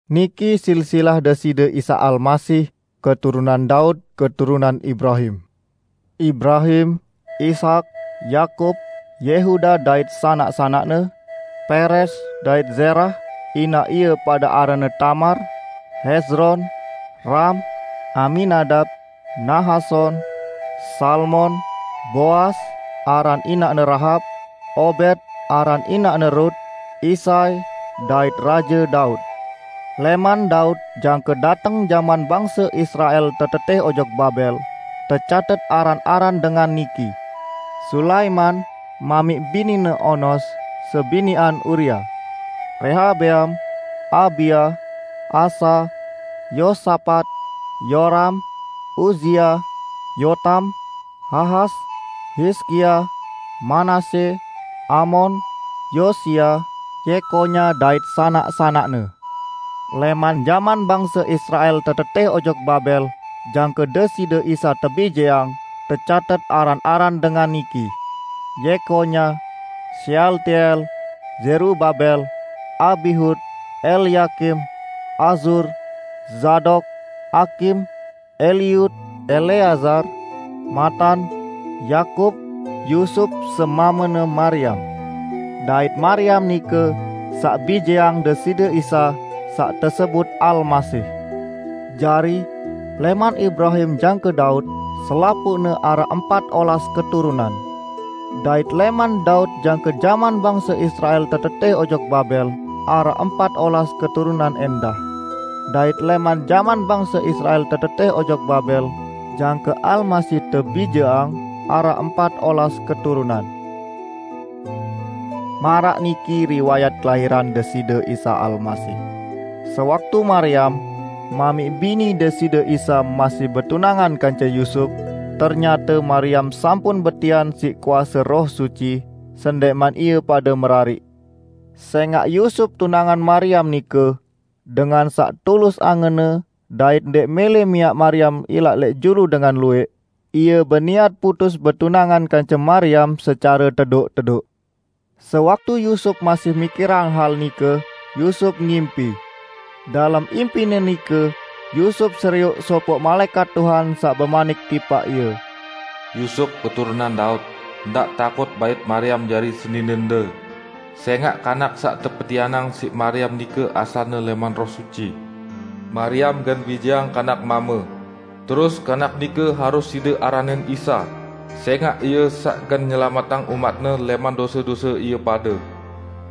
Niki silsilah Deside Isa Almasih, keturunan Daud, keturunan Ibrahim. Ibrahim, Ishak, Yakub, Yehuda dait sanak-sanakne, Peres dait Zerah (inaq ie pade aranne Tamar), Hezron, Ram, Aminadab, Nahason, Salmon, Boas (aran inaqne Rahab), Obed (aran inaqne Rut), Isai, dait Raje Daud. Lẽman Daud jangke dateng jaman bangse Israel tetetẽh ojok Babel tecatet aran-aran dengan niki: Sulaiman (mamiq binine onos sebiniqan Uria), Rehabeam, Abia, Asa, Yosapat, Yoram, Uzia, Yotam, Ahas, Hizkia, Manasye, Amon, Yosia, Yekonya dait sanak-sanakne. 12Lẽman jaman bangse Israel tetetẽh ojok Babel jangke Deside Isa tebijeang tecatet aran-aran dengan niki: Yekonya, Sealtiel, Zerubabel, Abihud, Elyakim, Azur, Zadok, Akim, Eliud, Eleazar, Matan, Yakub, Yusup semamene Mariam. Dait Mariam nike saq bijeang Deside Isa saq tesebut Almasih. 17Jari, lẽman Ibrahim jangke Daud, selapuqne araq empat olas keturunan, dait lẽman Daud jangke jaman bangse Israel tetetẽh ojok Babel, araq empat olas keturunan ẽndah, dait lẽman jaman bangse Israel tetetẽh ojok Babel jangke Almasih tebijeang araq empat olas keturunan. 18Maraq niki riwayat kelahiran Deside Isa Almasih: Sewaktu Mariam, mamiq bini Deside Isa masih betunangan kance Yusup, ternyate Mariam sampun betian siq kuase Roh Suci sendẽqman ie pade merariq. 19Sẽngaq Yusup tunangan Mariam nike, dengan saq tulus angenne dait ndẽq mẽlẽ miaq Mariam ilaq lẽq julu dengan luwẽq, ie beniat putus betunangan kance Mariam secare tedoq-tedoq. 20Sewaktu Yusup masih mikirang hal nike, Yusup ngimpi. Dalem impine nike, Yusup serioq sopoq malaẽkat Tuhan saq bemanik tipaq ie, "Yusup, keturunan Daud, ndaq takut bait Mariam jari seninende; sẽngaq kanak saq tepetianang siq Mariam nike asalne lẽman Roh Suci. 21Mariam gen bijeang kanak mame, terus kanak nike harus side aranin Isa, sẽngaq Ie saq gen nyelametang umat-Ne lẽman dose-dose ie pade."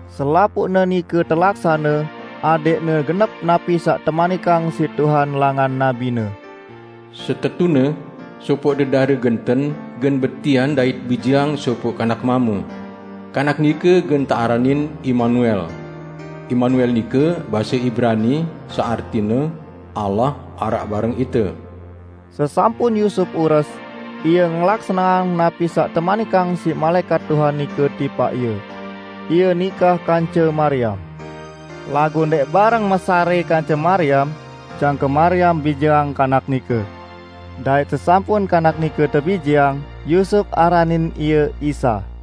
22Selapuqne nike telaksane adẽqne genep napi saq temanikang siq Tuhan langan nabi-Ne, 23"Setetune, sopoq dedare genten gen betian dait bijeang sopoq kanak mame. Kanak nike gen tearanin Imanuel." (Imanuel nike base Ibrani saq artine, "Allah araq bareng ite".) 24Sesampun Yusup ures, ie ngelaksaneang napi saq temanikang siq malaẽkat Tuhan nike tipaq ie. Ie nikah kance Mariam. 25Laguq ndẽq bareng mesarẽ kance Mariam jangke Mariam bijeang Kanak nike. Dait sesampun Kanak nike tebijeang, Yusup aranin Ie Isa.